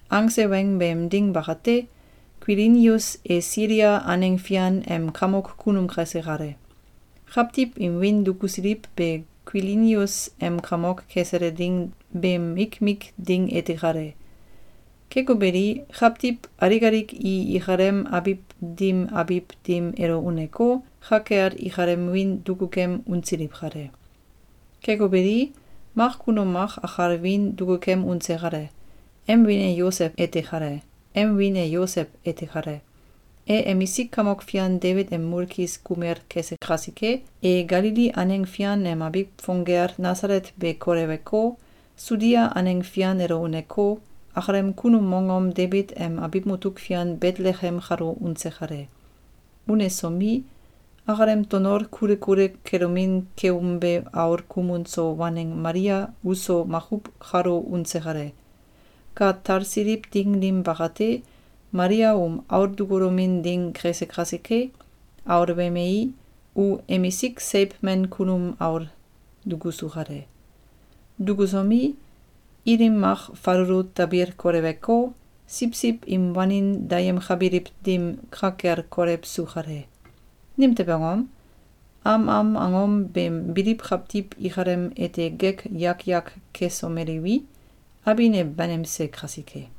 Angse weng beem ding bakate, Kuilinius e Silia aneng fian em kamok kunum kese kale. Kawtiw im wiin dukusiliw be Kuilinius em kamok kesele ding beem mikmik ding ete kale. Keko beli, kawtiw alik alik i ikalem abiw dim abiw dim elo uneko, ka kel ikalem wiin dukukem unsiliw kale. Keko beli, mak kunum mak akal wiin duku kem unse kale. Em wiin e Yosew ete kale. E emisik kamok fian Debit em mulkis kumel kese kasike, e Galili aneng fian em abiw fong gel Nasalet be koleweko, Sudia aneng fian elo uneko, akalem kunum mongom Debit em abiw mutuk fian Betelekem kalo unse kale. Unesomi, akalem tonol kule kule kelomin keumbe aul kumun so waneng Malia uso makuw kalo unse kale. Ka talsiliw ding dim bakate, Malia um aul dukulomin ding kese kasike, aul wemei, u emisik seiw men kunum aul dukusu kale. Dukusomi, ilim mak falulu tabil koleweko, siwsiw im wanin dayemkabiliw dim ka kel kolewsu kale. Nimtew angom? Am am angom beem biliw kawtiw ikalem ete gek yak yak kesomeliwi, abin e banimse kasike.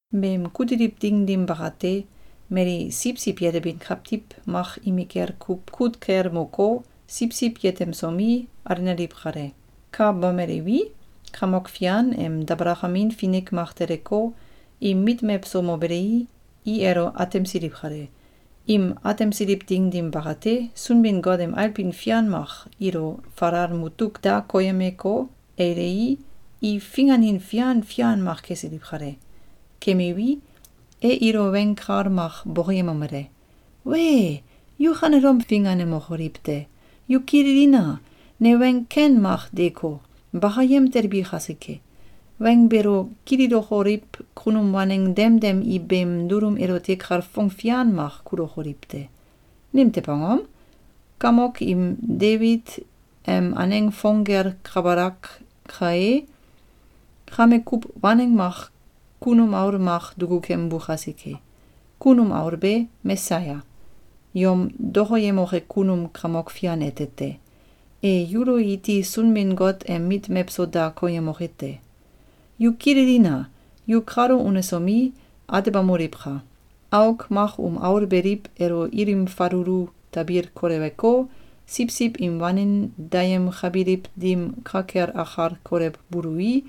Beem kutiliw ding dim bakate, mali siwsiw yetebin kawtiw mak imikel kuw kut kel moko, siwsiw yetemsomi, alenaliw kale. Ka bomeliwi, Kamok Fian em dabalakamin finik mak teleko, im mit mewso mobelei, i elo atemsiliw kale. Im atemsiliw ding dim bakate, Sunbin-Got em ailbin fian mak ilo falal mutuk da koyemeko, ailei, i finganin fian fian mak kesiliw kale. Kemiwi, e ilo weng kal mak bokoyemomele: “Wee! Yu kanelom finganemokoliw te! Yu kililina! Ne weng ken mak deeko, bakayem telbi kasike. Weng beelo kililokoliw kunum waneng demdem i beem dulum elote kalfong fian mak kulokoliw te. Nimtew angom? Kamoki Debit em aneng fong gel kabalak kae, kame kuw waneng mak kunum aul mak duku kembu kasike. Kunum aul be Mesaya, yom dokoyemoke kunum Kamok Fian ete te. E yulo iti Sunbin-Got em mit mewso da koyemoke te. Yu kililina! Yu kalo unesomi, atebamoliwka! Auk mak um aul beliw elo ilim falulu tabil koleweko, siwsiw im wanin dayemkabiliw dim ka kel akal kolewbului,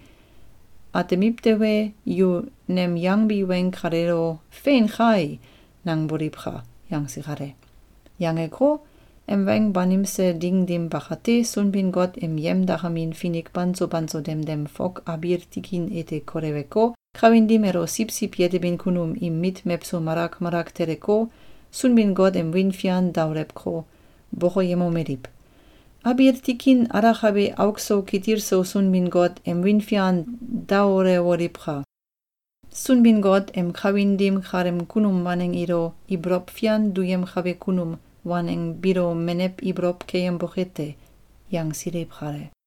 atmiw tewe, yu nem yangbi weng kaleelo ‘Fein kai!’, nangboliwka!”, yangse kale. Yangeko, em weng banimse ding dim bakate, Sunbin-Got em yemdakamin finik banso banso demdem fok abiil tikin ete koleweko, kawin dim elo siwsiw yetebin kunum im mit mewso malak malak teleko, Sunbin-Got em wiin fian daolewko, bokoyemomeliw: “Abiil tikin alakabe auk so kitil so Sunbin-Got em wiin fian daolewoliwka! Sunbin-Got em kawin dim kaleem kunum waneng ilo ibolow fian duyemkabe kunum waneng biilo menew ibolow keyemboke te!”, yangsiliw kale.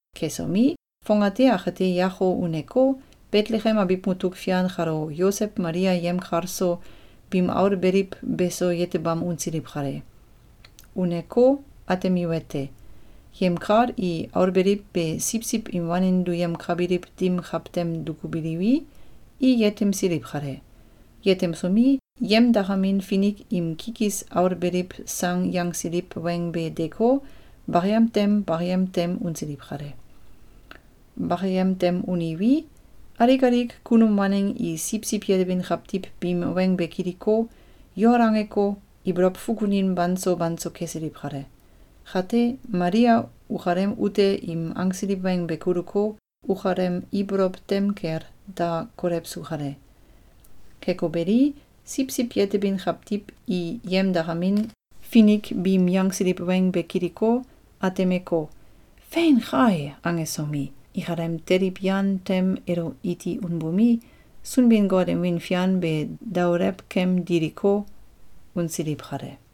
Kesomi, fongate akate yako uneko, Betelekem abiw mutuk fian kalo Yosew Malia yemkal so, biim aul beliw beso yetebam unsiliw kale. Uneko, atemiwete: Yemkal i aul beliw be siwsiw im wanin duyemkabiliw dim kawtem dukubiliwi, i yetemsiliw kale. Yetemsomi, yemdakamin finik im kikis aul beliw sang yangsiliw weng be deeko, bakayem tem bakayem tem unsiliw kale. Bakayem tem uniwi, alik alik kunum waneng i siwsiw yetebin kawtiw biim weng be kiliko, yol angeko, ibolow fukunin banso banso kesiliw kale. Kate, Malia ukalem ute im angsiliw weng be kuluko, ukalem ibolow tem kel da kolewsu kale. Keko beli, siwsiw yetebin kawtiw i yemdakamin finik biim yangsiliw weng be kiliko, atemeko, “Fein kai!”, angesomi, ikalem teliw yan tem elo iti unbomi, Sunbin-Got em wiin fian be daolew kem diliko, unsiliw kale.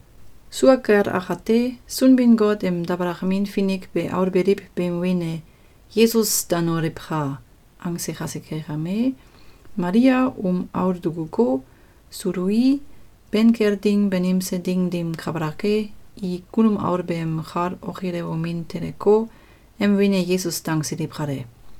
Sua kel akate, Sunbin-Got em dabalakamin finik be aul beliw beem wiin e “Yesus danoliwka!”, angse kasike kame, Malia um aul dukuko, sului, ben kel ding banimse ding dim kabalak e, i kunum aul beem kal okilewomin teleko, em wiin e Yesus dangsiliw kale.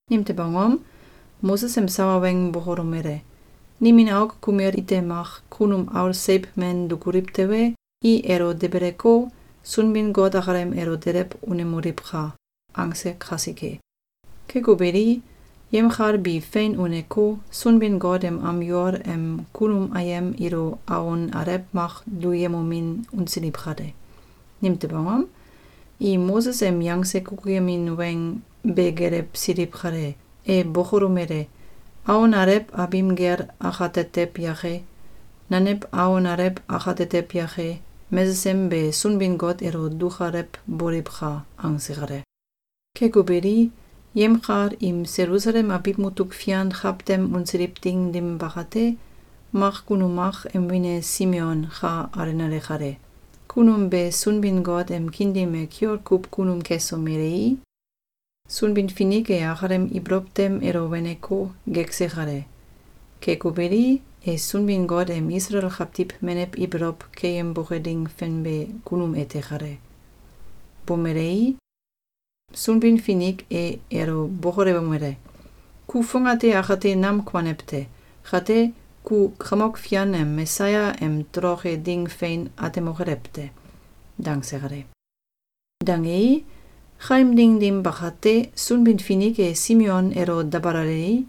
Nimtew angom? Moses em sawa weng bokolomele: “Nimin auk kumel ite mak kunum aul seiw men dukuliw tewe, i elo debeleko, Sunbin-Got akalem elo delew unemoliwka!”, angse kasike. Keko beli, yemkal bi fein uneko, Sunbin-Got em am yol em kunum ayem ilo awon alew mak duyemomin unsiliw kale. Nimtew angom? I Moses em yangse kukuyemin weng be gelewsiliw kale. E bokolomele: “Awon alew abim gel akatetew yake, nanew awon alew akatetew yake, mesesem be Sunbin-Got elo dukalewboliwka!”, angse kale. Keko beli, yemkal im Selusalem abiw mutuk fian kawtem unsiliw ding dim bakate, mak kunum mak em wiin e Simeon ka alenale kale. Kunum be Sunbin-Got em kiin dim e kiol kuw kunum kesomelei, Sunbin-Finik e akalem ibolow tem elo weneko, gekse kale. Keko beli, e Sunbin-Got em Isalael kawtiw menew ibolow keyemboke ding fenbe kunum ete kale. Bomelei, Sunbin-Finik e elo bokolewomele: “Ku fongate akate nam kuanew te. Kate, ku Kamok Fian em Mesaya em toloke ding fein atemokelew te.”, dangse kale. Dangei, kaem ding dim bakate, Sunbin-Finik e Simeon elo dabalalei,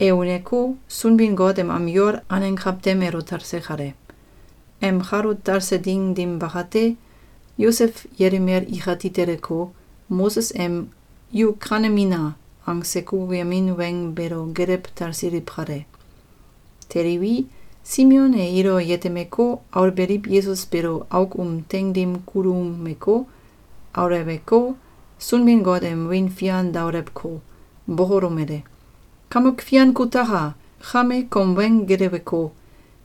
e uneko, Sunbin-Got em am yol aneng kawtem elo talse kale. Em kalo talse ding dim bakate, Yosew yelimel ikati teleko, Moses em “Yu kanemina!”, angse kukuyemin weng beelo gelew talsiliw kale. Teliwi, Simeon e ilo yetemeko, aul beliw Yesus beelo auk um teing dim kuluumeko, auleweko, Sunbin-Got em wiin fian daolewko, bokolomele: “Kamok Fian kutaka! Kame, kom weng geleweko,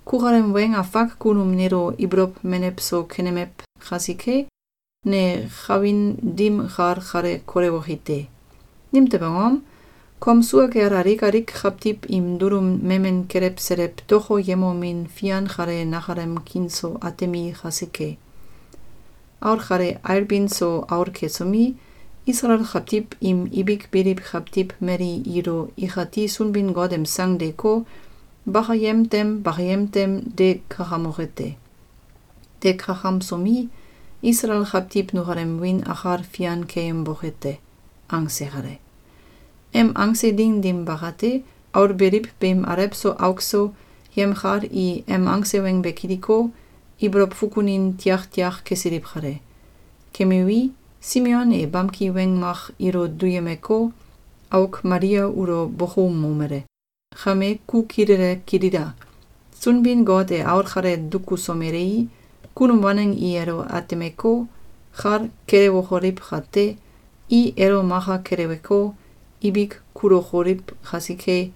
kukalem weng afak kunum neelo ibolow menew so kenemew kasike, ne kawin dim kal kale kolewoki te. Nimtew angom? Kom sua kel alik alik kawtiw im dulum memen kelewselew dokoyemomin fian kale nakalem kiin so atemi kasike. Aul kale ailbin so aul kesomi, Isalael kawtiw im ibik biliw kawtiw mali ilo ikati Sunbin-Got em sang deeko, bakayem tem bakayem tem de kakamoke te. De kakamsomi, Isalael kawtiw nukalem wiin akal fian keyemboke te.”, angse kale. Em angse ding dim bakate, aul beliw beem alew so auk so, yemkal i em angse weng be kiliko, ibolow fukunin tiaktiak kesiliw kale. Kemiwi, Simeon e bamki weng mak ilo duyemeko, auk Malia ulo bokoumomele: “Kame, ku kilele kilila! Sunbin-Got e aul kale dukusomelei, kunum waneng i elo atemeko, kal kelewokoliw kate, i elo maka keleweko, ibik kulokoliw kasike,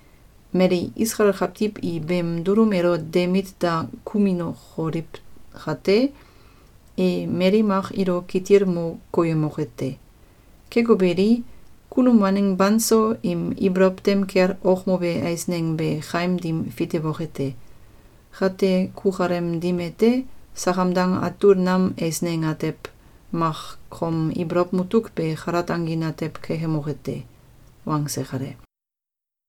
mali Isalael kawtiw i beem dulum elo de mit da kuminokoliw kate, e mali mak ilo kitil mo koyemoke te. Keko beli, kunum waneng banso im ibolow tem kel okmobe eisneng be kaim dim fitewoke te. Kate kukalem dim ete, sakam dang atul nam eisneng atew mak kom ibolow mutuk be kalat angin atew kekemoke te.”, wangse kale.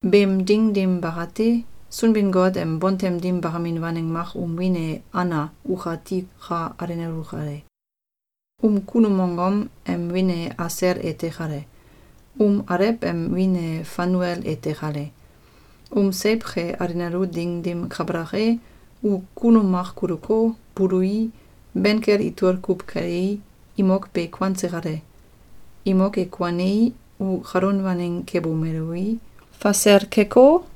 Beem ding dim bakate, Sunbin-Got em bontem dim bakamin waneng mak um wiin e Ana ukati ka alenalu kale. Um kunum mongom em wiin e Asel ete kale. Um alew em wiin e Fanuel ete kale. Um seiw ke alenalu ding dim kabalak e, u kunum mak kuluko, bului, ben kel itol kuw kelei, imok be kuanse kale. Imok e kuanei, u kalun waneng kebomelui, fasel keko,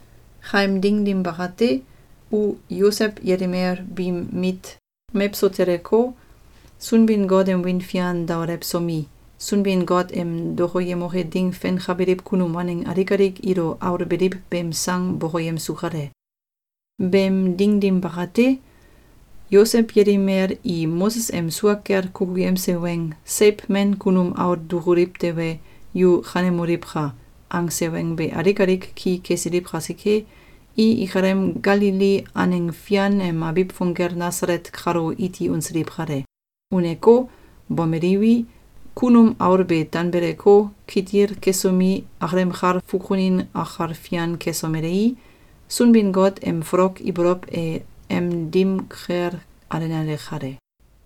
Kaem ding dim bakate, u Yosew yelimel biim mit mewso teleko, Sunbin-Got em wiin fian daolewsomi, Sunbin-Got em dokoyemoke ding fenkabiliw kunum waneng alik alik ilo aul beliw beem sang bokoyemsu kale. Beem ding dim bakate, Yosew yelimel i Moses em sua kel kukuyemse weng “Seiw men kunum aul dukuliw tewe, yu kanemoliwka!”, angse weng be alik alik ki kesiliw kasike, i ikalem Galili aneng fian em abiw fong gel Nasalet kalo iti unsiliw kale. Uneko, bomeliwi, kunum aul be tanbeleko, kitil kesomi, akalem kal fukunin akal fian kesomelei, Sunbin-Got em folok ibolow e em dim kel alenale kale.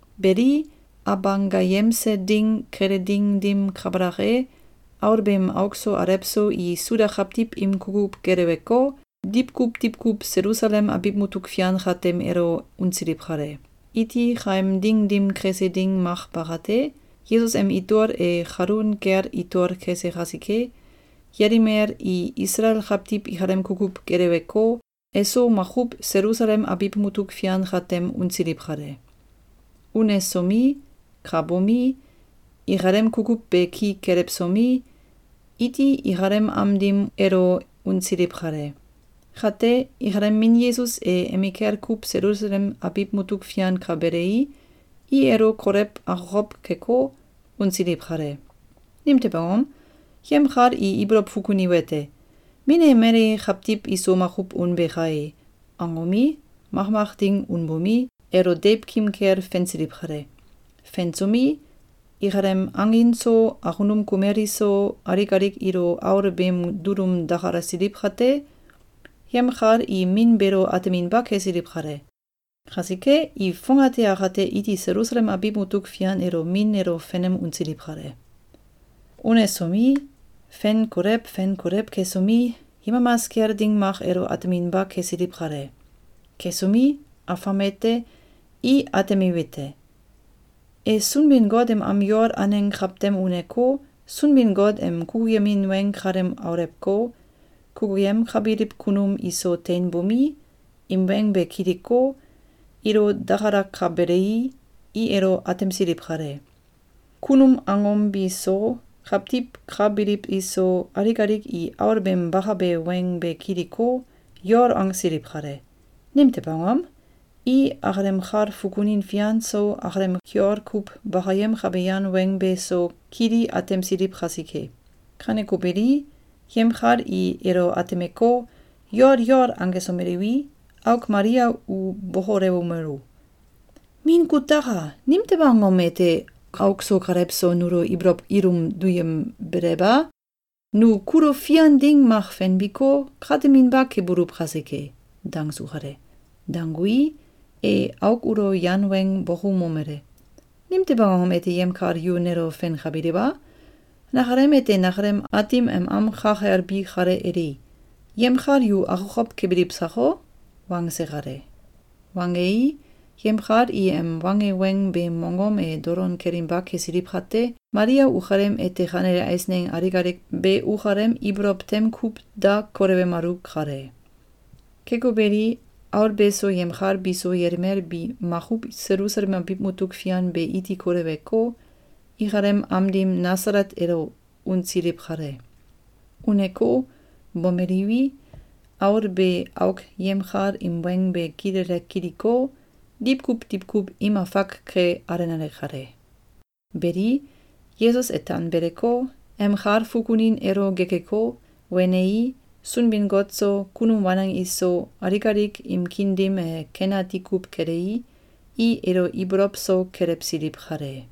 Beli, Abanggayemse Ding kele ding dim kabalak e, aul beem auk so alew so i Suda kawtiw im kukuw geleweko, diwkuw diwkuw Selusalem abiw mutuk fian katem elo unsiliw kale. Iti kaem ding dim kese ding mak bakate, Yesus em itol e kalun kel itol kese kasike, yelimel i Isalael kawtiw ikalem kukuw geleweko, eso makuw Selusalem abiw mutuk fian katem unsiliw kale. Unesomi, ka bomi, ikalem kukuw be ki kelewsomi, iti ikalem am dim elo unsiliw kale. Kate, ikalem min Yesus e emikel kuw Selusalem abiw mutuk fian ka belei, i elo kolew akokow keko, unsiliw kale. Nimtew angom? Yemkal i ibolow fukuniwete: “Min e mali kawtiw iso makuw unbe kai!”, angomi, makmak ding unbomi, elo deiwkim kel fensiliw kale. Fensomi, ikalem angin so, akunum kumel iso, alik alik ilo aul beem dulum dakalasiliw kate, yemkal i min beelo ateminba kesiliw kale. Kasike, i fongate akate iti Selusalem abiw mutuk fian elo min elo fenem unsiliw kale. Unesomi, fen kolew fen kolew kesomi, yemamas kel ding mak elo ateminba kesiliw kale. Kesomi, afam ete, i atemiwete: E Sunbin-Got em am yol aneng kawtem uneko, Sunbin-Got em kukyemin weng kalem aulewko, kukuyemkabiliw kunum iso teinbomi, im weng be kiliko, ilo dakalakabelei, i elo atemsiliw kale. Kunum angom bi so, kawtiw ka biliw iso, alik alik i aul beem bakabe weng be kiliko, yol angsiliw kale. Nimtew angom? I akalem kal fukunin fian so, akalem kiol kuw bakayemkabe yan weng be so, kili atemsiliw kasike. Kaneko beli, yemkal i elo atemeko, yol yol angesomeliwi, auk Malia u bokolewomelu: “Min kutaka! Nimtew angom ete kauk so kalew so nulo ibolow ilum duyembelew a? Nu kulo fian ding mak fenbiko, kateminba kebuluw kasike.”, dangsu kale. Dangui, e auk ulo yan weng bokoumomele: “Nimtew angom ete yemkal yu nelo fenkabiliw a? Nakalem ete nakalem Aatim em am ka kel bi kale eli! Yemkal yu akokow kebiliw sako?”, wangse kale. Wangei, yemkal i em wange weng beem mongom e dolon kelinba kesiliw kate, Malia ukalem ete kanele eisneng alik alik be ukalem ibolow tem kuw da kolewemalu kale. Keko beli, aul beso yemkal biso yelimel bi makuw Selusalem abiw mutuk fian be iti koleweko, ikalem am dim Nasalet elo unsiliw kale. Uneko, bomeliwi, aul be auk yemkal im weng be kilele kiliko, diwkuw diwkuw im afak ke alenale kale. Beli, Yesus e tanbeleko, em kal fukunin elo gekeko, wenei, Sunbin-Got so, kunum waneng iso, alik alik im kiin dim e ken ati kuw kelei, i elo ibolow so kelewsiliw kale.